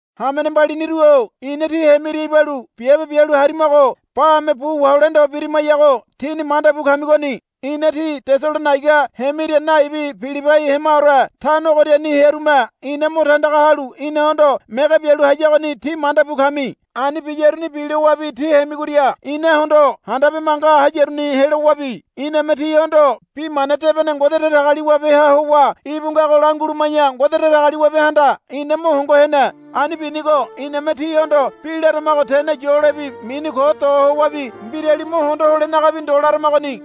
Hamene mbaliniru-o ina tí hemiria ibalu biabe bialu harimago bame bu wahole ndo birimayago tíni mandabu kamigoni. Ina tí Tesalonaiga hemiria naibi Pilibai hemaore tano ogoriani hearume ina mo tandaga halu inahondo mege bialu hayagoni tí manda bu kami. Ani biyaruni bilowabi tí hemigoria inahondo handabe manga hayaruni helowabi iname tíhondo Bi Mana Debene Ngode Datagaliwabeha howa íbu ngago languluma̱ya Ngode Datagaliwabehanda ina mo hongo hene. Ani binigo iname tíhondo bi laramago tene yolebi mini ko do howabi mbirali mo hondo holenagabi ndo laramagoni.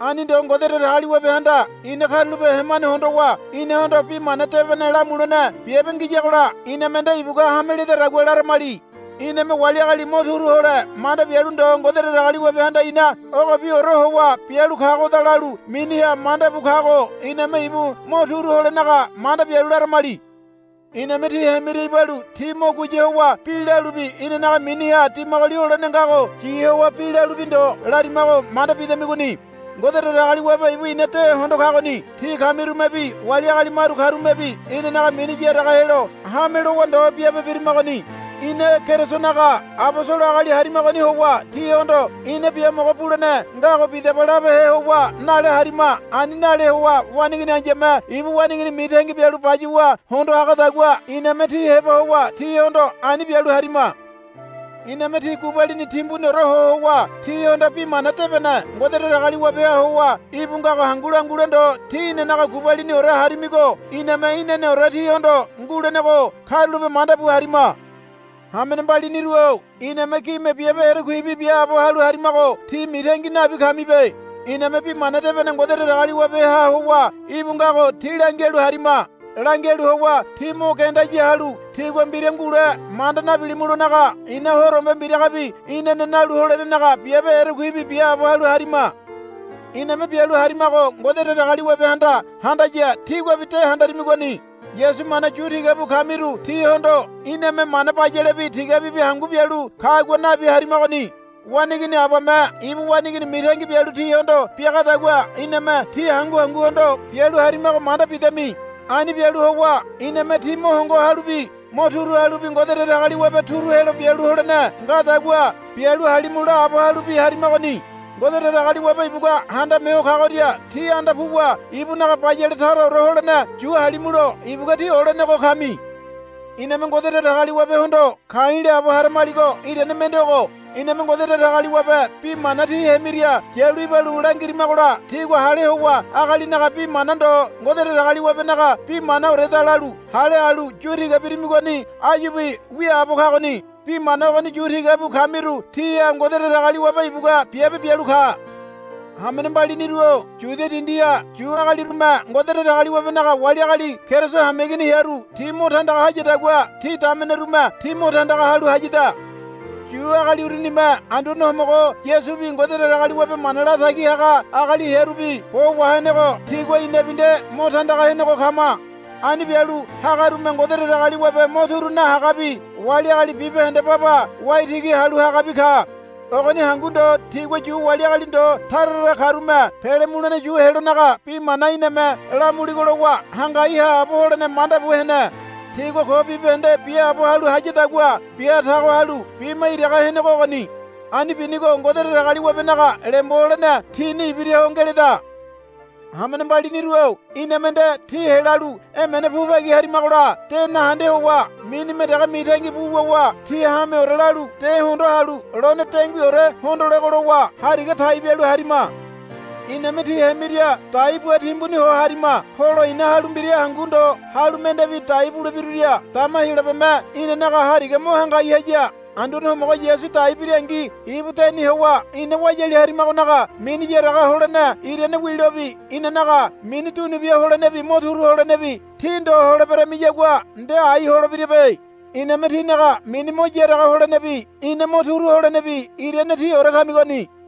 Ani ndo Ngode Datagaliwabehanda ina karulape hemane hondowa inahondo Bi Mana Debene lamulene biabe ngiyagola iname nde ibugua hame ledadagua laramali. Iname wali agali mo turu hole manda bialu ndo Ngode Datagaliwabehanda ina ogobiore howa bialu kagoda lalu miniha manda bu kago iname ibu mo turu holenaga manda bialu laramali. Iname tí hemiria ibalu tí mo guya howa bi lalubi inanaga miniha dimagoli holene ngago yi howa bi lalubi ndo larimago manda bidamigoni. Ngode Datagaliwabe ibu ina de hondo kagoni. Tí kamirumebi wali agali maru karumebi inanaga mini yaraga helo hame lowa ndo biabe birimagoni. Ina Kerisonaga abosolo agali harimagoni howa tíhondo ina biamogo bulene ngago bidaba labehe howa nale harima. Ani nale howa waneigini ai̱yame ibu waneigini mitangi bialu bayuwa hondo hagadagua iname tí heba howa tíhondo ani bialu harima. Iname tí gubalini timbuniore ho howa tíhondo Bi Mana Debene Ngode Datagaliwabeha howa íbu ngago hangu langule ndo tí inanaga gubaliniore harimigo iname inaneore tíhondo ngulenego karulape manda bu harima. Hamene mbaliniru-o iname gime biabe erekuibi biaabo halu harimago tí mitangi nabi kamibe. Iname Bi Mana Debene Ngode Datagaliwabeha howa íbu ngago tí langialu harima. Langialu howa tí mo genda ya halu tígua mbira ngule manda nabilimulonaga ina horombe mbiragabi inane nalu holenenaga biabe erekuibi biaabo halu harima. Iname bialu harimago Ngode Datagaliwabehanda handaya tíguabi de handarimigoni. Yasu mana yu tiga bu kamiru tíhondo iname mana bayalebi tigabibi hangu bialu kagua nabi harimagoni. Waneigini abame ibu waneigini mitangi bialu tíhondo biagadagua iname tí hangu hanguhondo bialu harimago manda bidami. Ani bialu howa iname tí mo hongo halubi mo turu halubi Ngode Datagaliwabe turu helo bialu holene ngadagua bialu halimu laabo halubi harimagoni. Ngode Datagaliwabe ibugua Handame Ho Kagoria tí anda puwa ibunaga bayale taraore holene yu halimulo ibugua tí olenego kami. Iname Ngode Datagaliwabehondo ka̱i̱ laabo haramaligo irane mende ogo. Iname Ngode Datagaliwabe bi mana tí hemiria yalu ibalu langirimagola tígua hale howa agalinaga bi mana ndo Ngode Datagaliwabenaga bi manaoreda lalu hale halu yu tiga birimigoni áyubi wiaabo kagoni. Bi mana ogoni yu tiga bu kamiru tíha Ngode Datagaliwabe ibugua biabe bialu ka. Hamene mbaliniru-o Yudia dindiha Yu agalirume Ngode Datagaliwabenaga wali agali Keriso hameigini hearu ti mo tandaga hayadagua tí damenerume tí mo tandaga halu hayada. Yu agali urunime Anduane Homogo Yasubi Ngode Datagaliwabe mana latagi haga agali hearubi bo wahenego tigua inabi nde mo tandaga henego kama. Ani bialu hagarume Ngode Datagaliwabe mo turu nahagabi wali agali bibahende baba waitigi halu hagabi ka. Ogoni hangu ndo tigua Yu wali agali ndo tara tara karume pele mulene yu helonaga bi mana iname lamuligo lowa hangai haabo holene manda bu hene. Tigua ko bibahende biaabo halu hayadagua bia tago halu bima iraga henego ogoni. Ani binigo Ngode Datagaliwabenaga lembo holene tini ibiraho ngeleda. Hamene mbaliniru-o iname nde tí helalu emene pu bagi harimagola de nahende howa minime dege mitangi bu wuwa tí hameore lalu de hondoa halu lone denguiore hondolego lowa hariga tai bialu harima. Iname tí hemiria dai bua timbuni ho harima. Polo i̱na halu mbira hangu ndo halu mendebi dai bulebiruria dama Heyolabeme inanaga hariga mo hangai haya. Anduane Homogo Yasu dai birangi ibu deni howa ina wayali harimagonaga mini yaraga holene irane wilobi inanaga mini dunu bia holenebi mo turu holenebi tí ndo holeberamiyagua nde ai holebirabe. Iname tínaga mini mo yaraga holenebi ina mo turu holenebi irane tíore kamigoni.